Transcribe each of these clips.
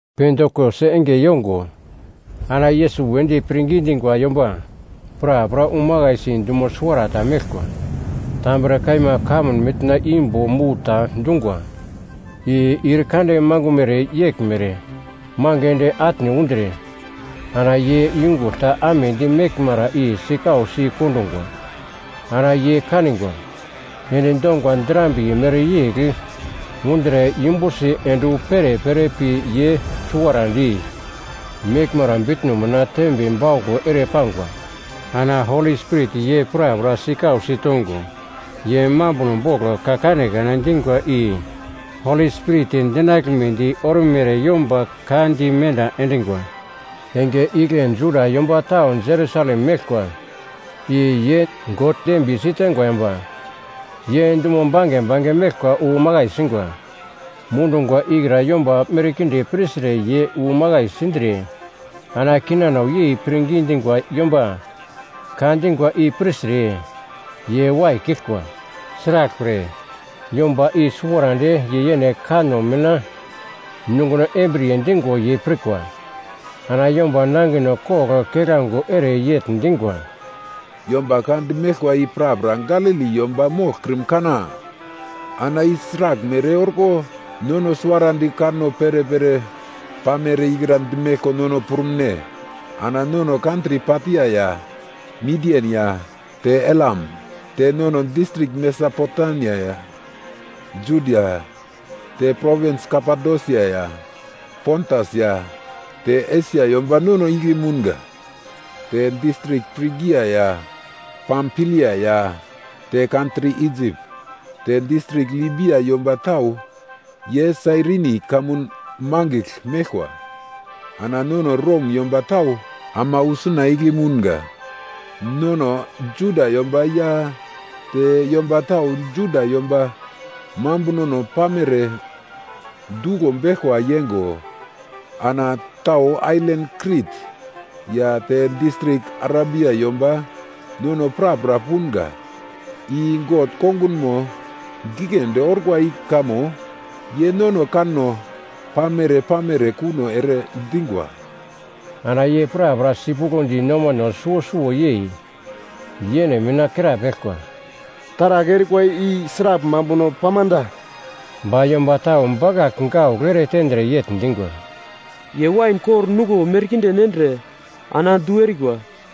Pentikos enge yongo ana Yesus wedi pirngi dingwa yomba prapra wu makaisi dumo suwarata meglkwa. Tambre kaima kamun mitna imbo mu ta dungwa, i ir kande mangumere yeglmere mange ende atne undre, ana ye yungugl ta amedi meglmara i sikausi kondungwa. Ana ye kanigwa, endi donga drambiye mereyegl undre yumbusi ende wu perepere pi ye suwarandi meglmara bitno mina tembe bauglo ere pangwa. Ana Holi Spirit ye prapra sikausi tongo, ye mambuno bogl ka kanekane dingwa i Holi Spirit dinaglmedi ormere yomba ka di menda endingwa. Enge igle Juda yomba tau Jerusalem meglkwa, i ye God dembiye siteingwa yomba, ye dumo bange bange meglkwa wu makai singwa. Mundungwa ikra yomba merkinde pirtre ye wu makai sindre ana kinano yei pirngi dingwa yomba ka dingwa i pirtre ye waikiglkwa. Sraglpre, yomba i suwarandi ye yene kanno mina nunguno embriye dingo ye pirkwa. Ana yomba nangino kogl keglango ere yegl dingwa, “Yomba ka dimeglkwa i prapra Galili yomba moglkrim kana? Ana i sraglmere orko nono suwarandi kanno perepere pamere ikra dimeglko nono prumune? Ana nono kantri Patia ya, Midian ya te Elam; te nono distrik Mesopotemia ya Judia; te provins Kapadosia ya, Pontas ya te Esia yomba nono igle mounga. Te distrik Prigia ya, Pamfilia ya te kantri Isip; te distrik Libia yomba tau ye Sairini kamun mangigl meglkwa, ana nono Rom yomba tau ama wu suna igle mounga. Nono Juda yomba ya te yomba tau Juda yomba mambunono pamere duglo beglkwa yeingo, ana tau ailan Krit ya te distrik Arabia yomba, nono prapra punga; i God kongunmo giglendi orkwa i kamo ye nono kanno pamere-pamere kuno ere dingwa.” Ana ye prapra sipuglodi nomano suwo suwo yei yene mina krapeglkwa, “Taragl erikwa i sragl mambuno pamda?” Ba yomba tau bakagl gaugl eretendre yegl dingwa, “Ye wain kor nuglo merkinde nendre ana du erikwa.”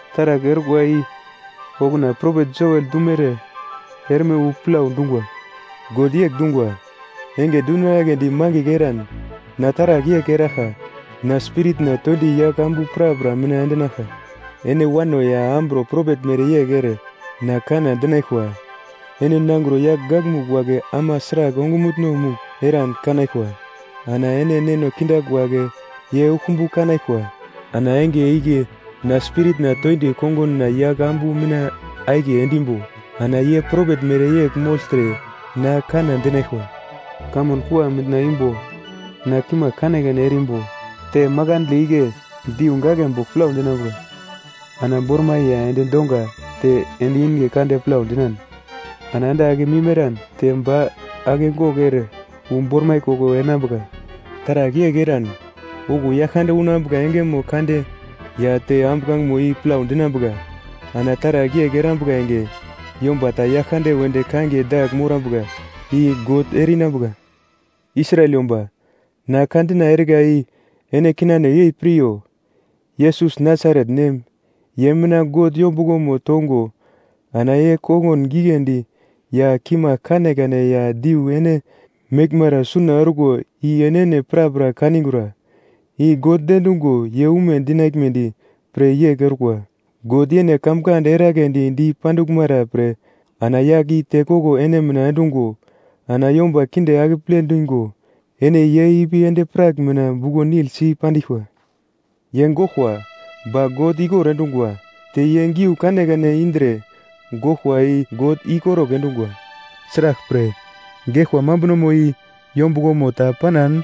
Taragl orkwa i okuna propet Joel dumere erme wu plau dungwa, “‘God yegl dungwa, Enge dundinagledi mangigl eran na taragl yegl eraglka, na Spiritna toindi yagl ambu prapra mina endinaglka. Ene wano ya amburo propet mereyegl ere na kanna dinaglkwa, ene nangro yagl gakmugl wagle ama sragl ongumutno-mugl eran kanaglkwa, ana ene neno kindagl wagle ye uglkumbu kanaglkwa. Ana enge igle na Spiritna toindi konguna yagl ambu mina akiye endimbo, ana ye propet mereyegl mogltre na kanna dinaglkwa. Kamun kua mitna imbo na kimagl kanekane erimbo, te makandle igle diu gaglebogl plau dinambuka, ana bormai ya endi donga te endi inge kande plau dinan, ana ande akemim eran te ba akegogl ere wu bormai koglo enambuka, taragl yegl eran, okuwo Yaglkande unambuka engemo kande ya te ambuglangemo i plau dinambuka. Ana taragl yegl erambuka enge, yomba ta Yaglkande wedi kangiye dagl morambuka, i God ere-inambuka.’ “Israel yomba, na ka dina erika i ene kinano yei piryo! Yesus Nasaret nem, ye mina God yombuglomo tongo ana ye kongun giglendi ya kimagl kanekane ya diu ene meglmara suna orkwa i enene prapra kanigura. I God diendungo ye ume dinaglmedi pre yegl orkwa. God yene kamkand eragledi di panduglmara pre ana yagl i tekoglo ene mina endungo ana yomba kinde akeple dingo ene ye ipi endi-prak mina buglo-nil si pandiglkwa. Ye goglkwa, ba God ikor endungwa, te ye giu kanekane indre goglkwa i God ikorugl endungwa. Sraglpre, geglkwa mambunomo i yombuglomo ta panan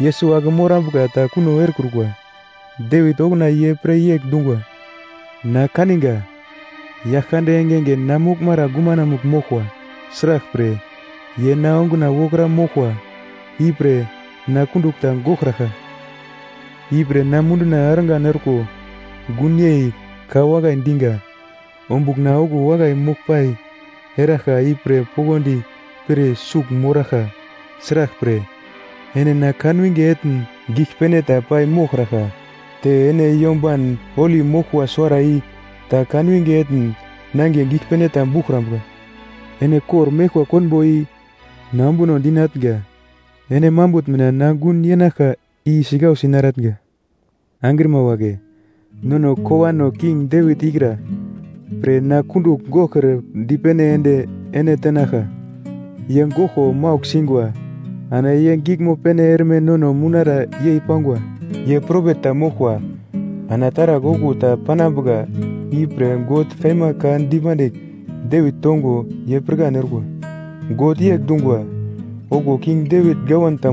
Yesus ake morambuka ta kuno erekrukwa. Devit okuna ye pre yegl dungwa: “‘Na kaninga, Yaglkande engenge na moglmara gumanamugl moglkwa. Sraglpre, ye na onguna wokra moglkwa, ipre na kundugl ta goglkraglka. Ipre na munduna argan orko gunyei ka wakai dinga, ombugl na okuwo wakai moglpai eraglka ipre poglodi pir sugl moraglka. Sraglpre, ene na kanwinge etn giglpene ta pai moglkraglka, te ene Yomban Holi Moglkwa Suwara i ta kanwinge etn nangiye giglpene ta buglkrambuka. Ene kor-meglkwa konbo i na ombunodi natnga, ene mambutn mina na gun yenaglka i sikausi naratnga.’ “Angrima wagle, nono kowano King Devit ikra pre na kundugl goglkre dipene ende ene tenaglka. Ye goglko maugl singwa, ana ye giglmo pene erme nono mounara yei pangwa. Ye propet ta moglkwa, ana taragl okuwo ta panambuka ipre God kaima ka dipandigl Devit tongo ye pirkan orkwa. God yegl dungwa, ‘Okuwo king Devit gawan ta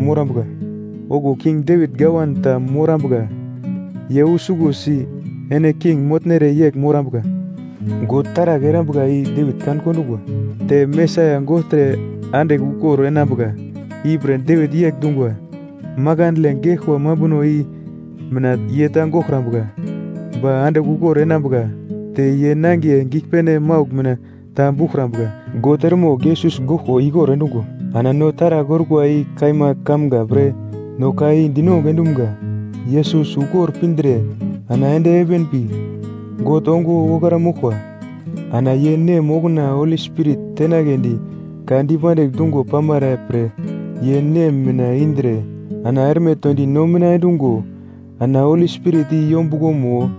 morambuka, ye usuglosi ene king motnere yegl morambuka.’ God taragl erambuka i Devit kan kondungwa, te Mesaia gogltre andigl ukor enambuka ipre Devit yegl dungwa, ‘Makandle geglkwa mambuno i mina ye ta goglkrambuka, ba andigl ukor enambuka, te ye nangiye giglpene maugl mina ta buglkrambuka.’ God eremogl Yesus goglko ikor endungwa, ana no taragl orkwa i kaima kamga pre no ka i dinongugl endumga. Yesus ukor pindre ana ende heven pi God ongo wokra moglkwa. Ana ye Nem okuna Holi Spirit tenagledi ka dipandigl dungo pamara pre ye Nem mina indre ana erme toindi no mina endungo, ana Holi Spirit i yombuglomo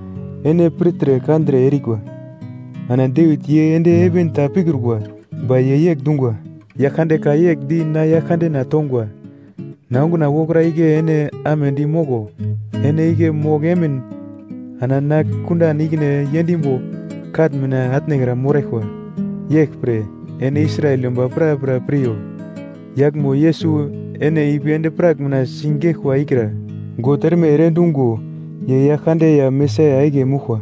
ene pirtre kandre erikwa. Ana Devit ye ende heven ta pikrukwa. Ba ye yegl dungwa, “‘Yaglkande ka yegl di na Yaglkandena tongwa: “Na onguna wokra igle ene amedi moglo. Ene igle mogl emin ana na kundan ikine yendimbo katn mina atnekra moraglkwa.” ’ “Yeglpre, ene Israel yomba prapra piryo, yaglmo Yesus ene ipi endi-prak mina sigeglkwa ikra, God erme ere endungo ye Yaglkande ya Mesaia akiye moglkwa!”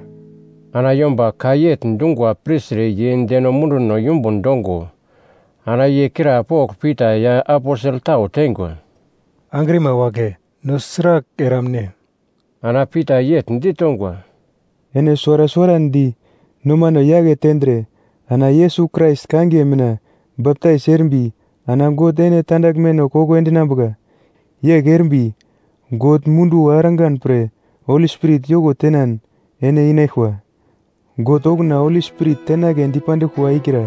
Ana yomba ka yegl dungwa pirtre ye deno munduno yumbun dongo ana ye krapogl Pita ya aposel tau teingwa, “Angrima wagle, no sragl eramne?” Ana Pita yegl ditongwa, “Ene suwara suwarandi nomano yake tendre ana Yesus Krais kangiye mina baptais erimbi ana God ene tandaglmeno koko endinambuka. Yegl erimbi God munduwo argan pre Holi Spirit yoko tenan ene inaglkwa. God okuna Holi Spirit tenagle dipanduglkwa ikra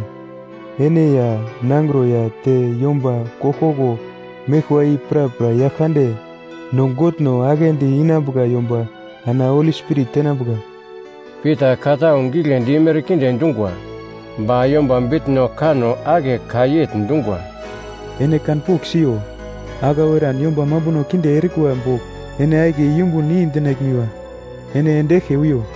ene ya, nangro ya te yomba koglkoglo meglkwa i prapra Yaglkande, no Godno aglendi inambuka yomba ana Holi Spirit tenambuka.” Pita ka tau giglendi merkinde dungwa, ba yomba bitno-kano ake ka yegl dungwa, “Ene kanpogl siyo. Aglau eran yomba mambuno kinde erikwa bogl ene akiye yumbun i-dinaglmiwa, ene ende eglke wiyo.”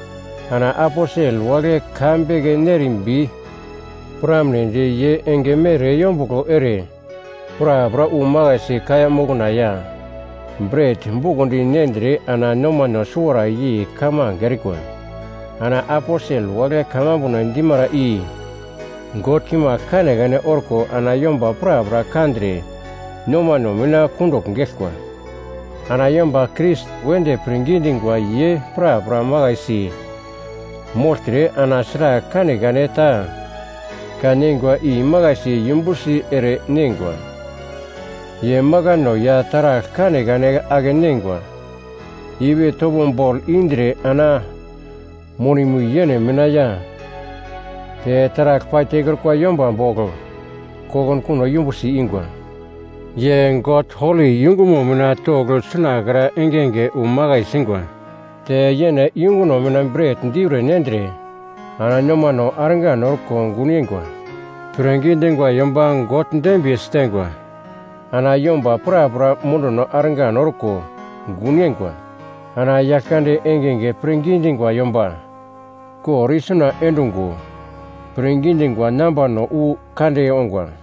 Ana aposel wagle ka beke nerimbi piramnedi ye enge mere yombuglo ere prapra wu makaisi kaiya mokna ya bret bukondi nendre ana nomano suwara yei kamange erikwa. Ana aposel wagle kamambuno dimara i God kimagl kanekane orko ana yomba prapra kandre nomano mina kundugl geglkwa. Ana yomba Krais wedi pirngi dingwa ye prapra makaisi mogltre ana sragl kanekane ta kan neingwa imakaisi yumbusi ere neingwa. Ye makano ya taragl kanekane ake-neingwa ipi topo bogl indre ana monimo i yene mina ya te taragl paitekrukwa yomba bogl kokunkuno yumbusi ingwa. Ye God holi yungumo mina togl sunakra engenge wu makai singwa. Te yene yunguno mina bret diure nendre ana nomano argan orko gun yeingwa. Pirngi dingwa yomba God dembiye siteingwa ana yomba prapra munduno argan orko gun yeingwa. Ana Yaglkande engenge pirngi dingwa yomba kor isuna endungo, pirngi dingwa nambano wu kande ongwa.